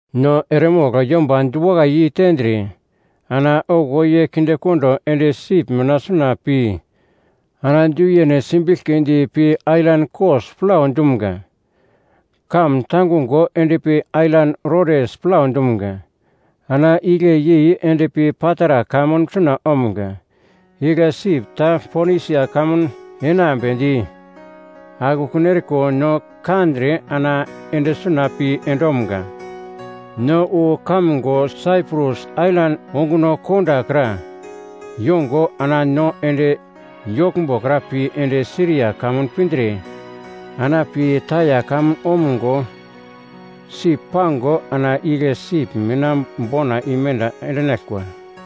No eremogl yomba diwakai yeitendre ana okuwo ye kindekondo ende sip mina suna pi ana du yene simbiglkidi pi ailan Kos plau dumga. Kamun tangungo endpi ailan Rodes plau dumga, ana igle yei endpi Patara kamun suna omga. Igle sip ta Ponisia kamun enambedi akekun eriko no kandre ana ende suna pi endomga. No wu kamgo Saiprus ailan onguno kondo kra yongo ana no ende yoglmbo kra pi ende Siria kamun pindre ana pi Taia kamun omgo, sip pango ana igle sip mina bona imenda endinaglkwa.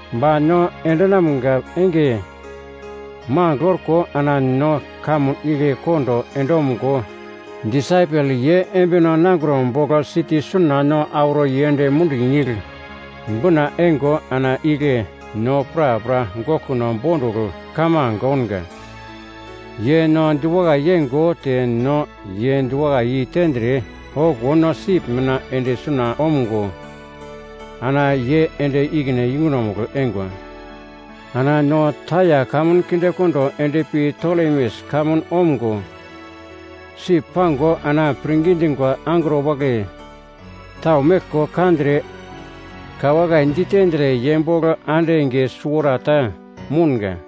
Ba no endinamga enge mangigl orko ana no kamun igle kondo endomgo disaipel ye embino nangro bogl siti suna no auro yend mundi nigl bina eingo ana igle no prapra goglkuno bondugl kamange ounga. Ye no diwakai yeingo te no ye diwakai yeitendre okuwo no sip mina ende suna omgo ana ye ende ikine yungunomugl eingwa. Ana no Taia kamun kindekondo endpi Tolemes kamun omgo sip pango ana pirngi dingwa angro wagle tau meglko kandre ka wakai ditendre ye bogl ande enge suwarata mounga.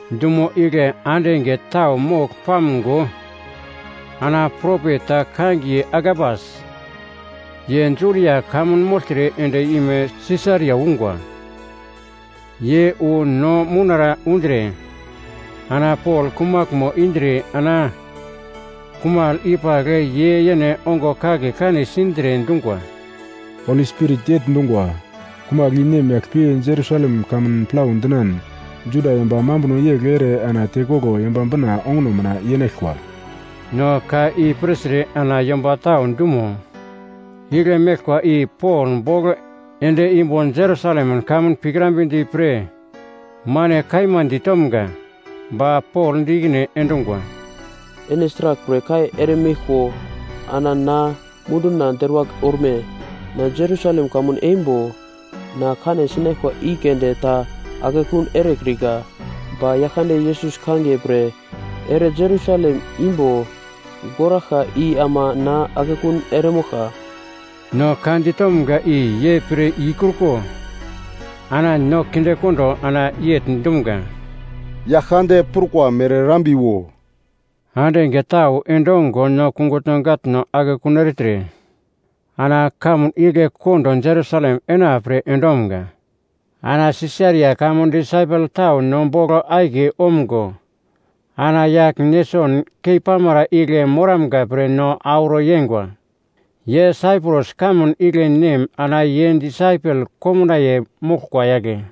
Dumo igle ande enge tau mogl pamgo ana propet ta kangiye Agabas, ye Judia kamun mogltre end-ime Sisaria ungwa. Ye wu no mounara undre ana Pol kumaglmo indre ana kumagl i pagl ye yene ongo kagle kan sindre dungwa, “Holi Spirit yegl dungwa, ‘Kumagl i nemyagl pi Jerusalem kamun plau dinan Juda yomba mambuno yegl ere ana tekoglo Yomba Bina onguno mina yenaglkwa.’” No ka i pirtre ana yomba tau dumo igle meglkwa i Pol bogl ende imbo Jerusalem kamun pikrambedi pre mane kaima ditomga. Ba Pol di ikine endungwa, “Ene sraglpre kai eremeglko ana na munduna deruwagl orme? Na Jerusalem kamun eimbo na kane sinaglkwa i keunde ta akekun erekrika, ba Yaglkande Yesus kangiye pre ere Jerusalem imbo goraglka i ama na akekun eremoglka.” No ka ditomga i ye pir ikruko ana no kindekondo ana yegl dumga, “Yaglkande prukwa mere erambiwo.” Ande enge tau endongo no kungutno gatno akekun ertre ana kamun igle kondo Jerusalem enapre endomga. Ana Sisaria kamun disaipel tau no bogl akiye omgo ana yagl Neson keipamara igle moramga pre no auro yengwa. Ye Saiprus kamun igle nem ana ye disaipel komnaiye moglkwa yagle.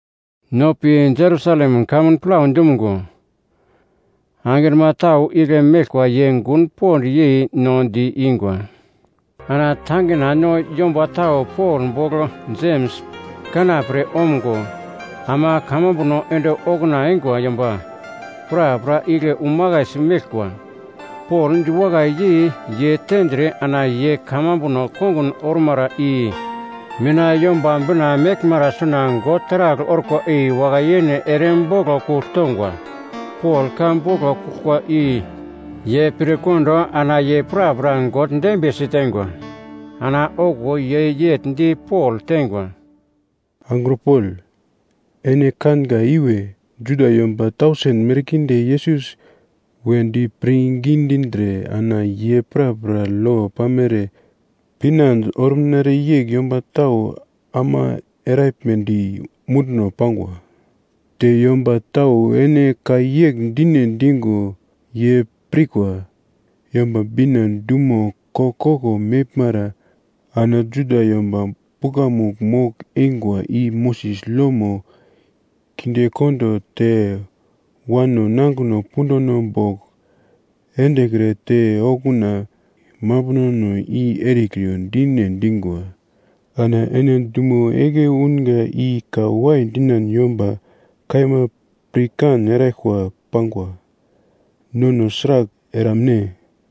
No pi Jerusalem kamun plau dumgo, Angrima tau igle meglkwa ye gun pond yei no di-ingwa. Ana tangina no yomba tau Pol bogl Jems kanapre omgo, ama kamambuno ende okuna eingwa yomba prapra igle umakaisi meglkwa. Pol diwakai yei ye tendre ana ye kamambuno kongun ormara i mina Yomba Bina meglmara suna God taragl orkwa i wakai-yene ere boglo kugl tongwa. Pol ka boglo kuglkwa i ye pirkondo ana ye prapra God dembiye siteingwa. Ana okuwo ye yegl di Pol teingwa, “Angro Pol, ene kanga iwe, Juda yomba tausen merkinde Yesus wedi pirngi dindre ana ye prapra lo pamere pinande orumnere yegl yomba tau ama eraglmedi munduno pangwa. Te yomba tau ene ka yegl dine dingo ye pirkwa, ‘Yomba Bina dumo koglkoglo meglmara ana Juda yomba pukamugl mogl-eingwa i Moses lomo kindekondo te wano nangino punduno bogl endekre te okuna mambunono i erekriyo dine dingwa.’ Ana ene dumo igle unga i ka wai dinan yomba kaima pirkan eraglkwa pangwa. Nono sragl eramne?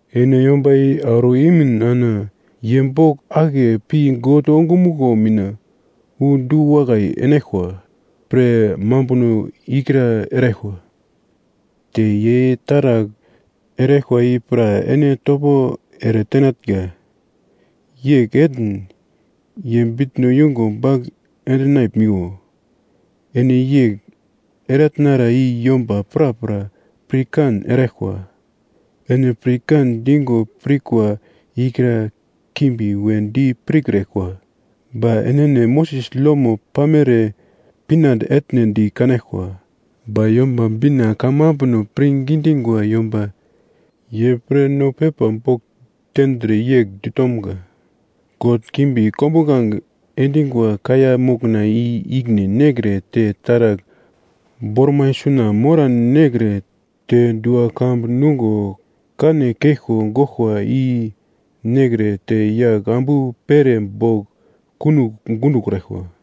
Ene yomba i auro imin ana ye bogl akiye pi God ongumuglo mina wu du-wakai enaglkwa pre mambuno ikra eraglkwa, te ye taragl eraglkwa i pra ene topo ere tenatnga, yegl etn ye bitno yungo bagl endinaglmiwo. Ene yegl eratnara i yomba prapra pirkan eraglkwa, ene pre kan digo pirkwa ikra kimbi wedi piraglkwa. Ba enene Moses lomo pamere pinande etne di kanaglkwa. Ba Yomba Bina kamambuno pirngi dingwa yomba ye pre no pepa bogl tendre yegl ditomga, ‘God kimbi kombuglange endingwa kaiya mokna i ikine nekre te taragl bormai suna moran nekre te dua-kambu nungo kane keglko goglkwa i nekre te yagl ambu pere bogl kunogl gundokraglkwa.’”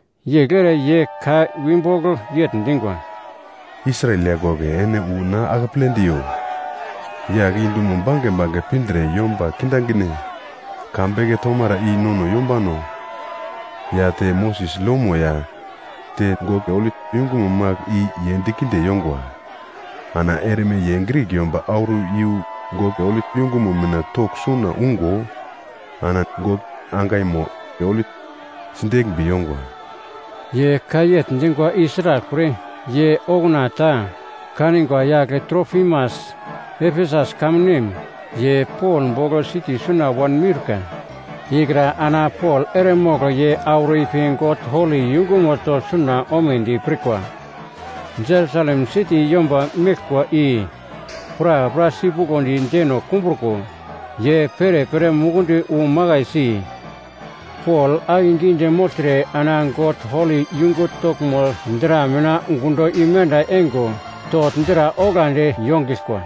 Yegl ere ye ka wibogl yegl dingwa, “Israel yagl wagle ene wu no akeple diyo! Yagl i dumo bange bange pindre yomba kindaginde ka beke tomara i nono yombano ya te Moses lomo ya te God holi yungumo magl i ye dikinde yongwa. Ana erme ye Grik yomba auro iyu God holi yungumo mina togl suna ungo ana God angaimo holi sideglmbi yongwa.” Ye ka yegl dingwa i sraglpre, ye okuna ta kanigwa yagl Trofimas, Efesus kamun nem, ye Pol bogl siti suna wanmiurka ikra ana Pol eremogl ye auro ipi God holi yungumo togl suna omedi pirkwa. Jerusalem siti yomba meglkwa i prapra sipuglodi deno kumbruko, ye perepere mukundi wu makaisi, Pol akegidi mogltre ana God holi yungu toglmo dra mina gundo imenda eingo, togl dra oglandi yongiglkwa.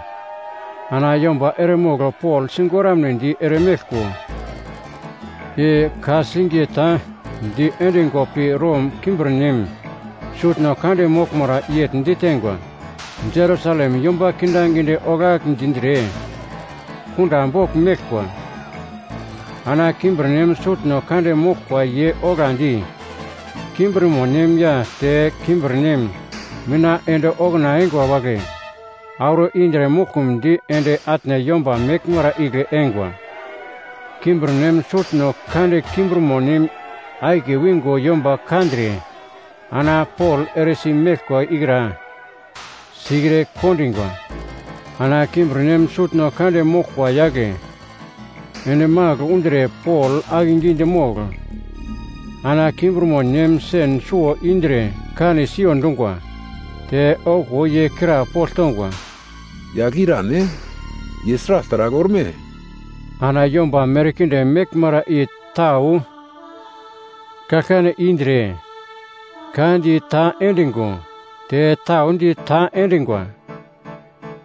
Ana yomba eremogl Pol sigoramnedi eremeglko i ka-singiye ta diendingo pi Rom kimbirnem sutno kande moglmara yegl ditengwa, “Jerusalem yomba kindaginde oglagl dindre kunda bogl meglkwa.” Ana kimbirnem sutno kande moglkwa ye oglandi kimbirmonem ya te kimbirnem mina ende okuna eingwa wagle auro indre muglkumdi ende atne yomba meglmara igle eingwa. Kimbirnem sutno kande kimbirmo nem akiye wingo yomba kandre ana Pol eresi meglkwa ikra sikre kondingwa. Ana kimbirnem sutno kande moglkwa yagle ende magl undre Pol akegidi mogl ana kimbirmonem sen suwo indre kane siyo dungwa. Te okuwo ye krapogl tongwa, “Yagl i irane? Ye sragl taragl orme?” Ana yomba merkinde meglmara i tau kaglkane indre ka di ta endingo te tau di ta endingwa.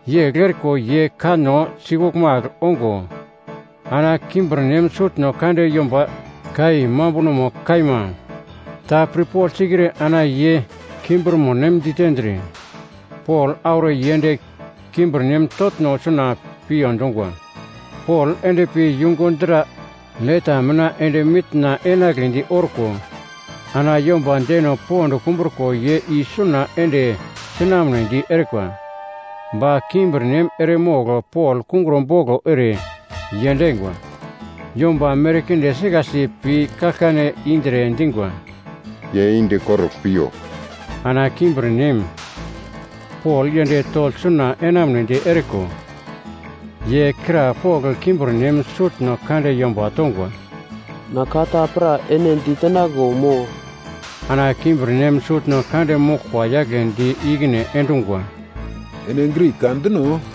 Yegl eriko ye kanno sikuglmagl ongo ana kimbirnem sutno kande yomba ka i mambunomo kaima ta pirpogl sikre ana ye kimbirmonem ditendre Pol auro yend kimbirnem toglno suna piyo dungwa. Pol endpi yungu dra leta mina ende mitna enagledi orko ana yomba deno pond kumbruko ye isuna ende sinamnedi erikwa. Ba kimbirnem eremogl Pol kungro boglo ere yendingwa. Yomba merkinde sikasi pi kaglkane indre dingwa, “Ye yende korugl piyo!” Ana kimbirnem, Pol yend togl suna enamunedi eriko, ye krapogl kimbirnem sutno kande yomba tongwa, “Na ka ta pra ene ditenaglo mo?” Ana kimbirnem sutno kande moglkwa yagle di ikine endungwa, “Ene Grik ka dino?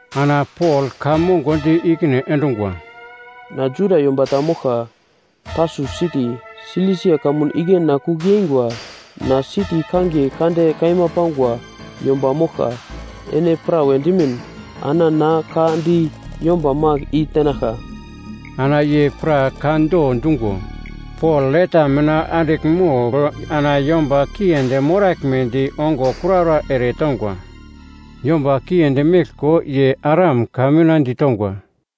Ana Pol ka mongo di ikine endungwa, “Na Juda yomba ta moglka, Tarsus siti, Silisia kamun igle na kugl yeingwa. Na siti kangiye kande kaima pangwa yomba moglka. Ene prawa dimin ana na ka di yomba magl i tenaglka.” Ana ye pra ka do dungo, Pol leta mina andigl mogl ana yomba kiendi moraglmedi ongo kuraura eretongwa. Yomba kiendi meglko ye Aram ka mina ditongwa,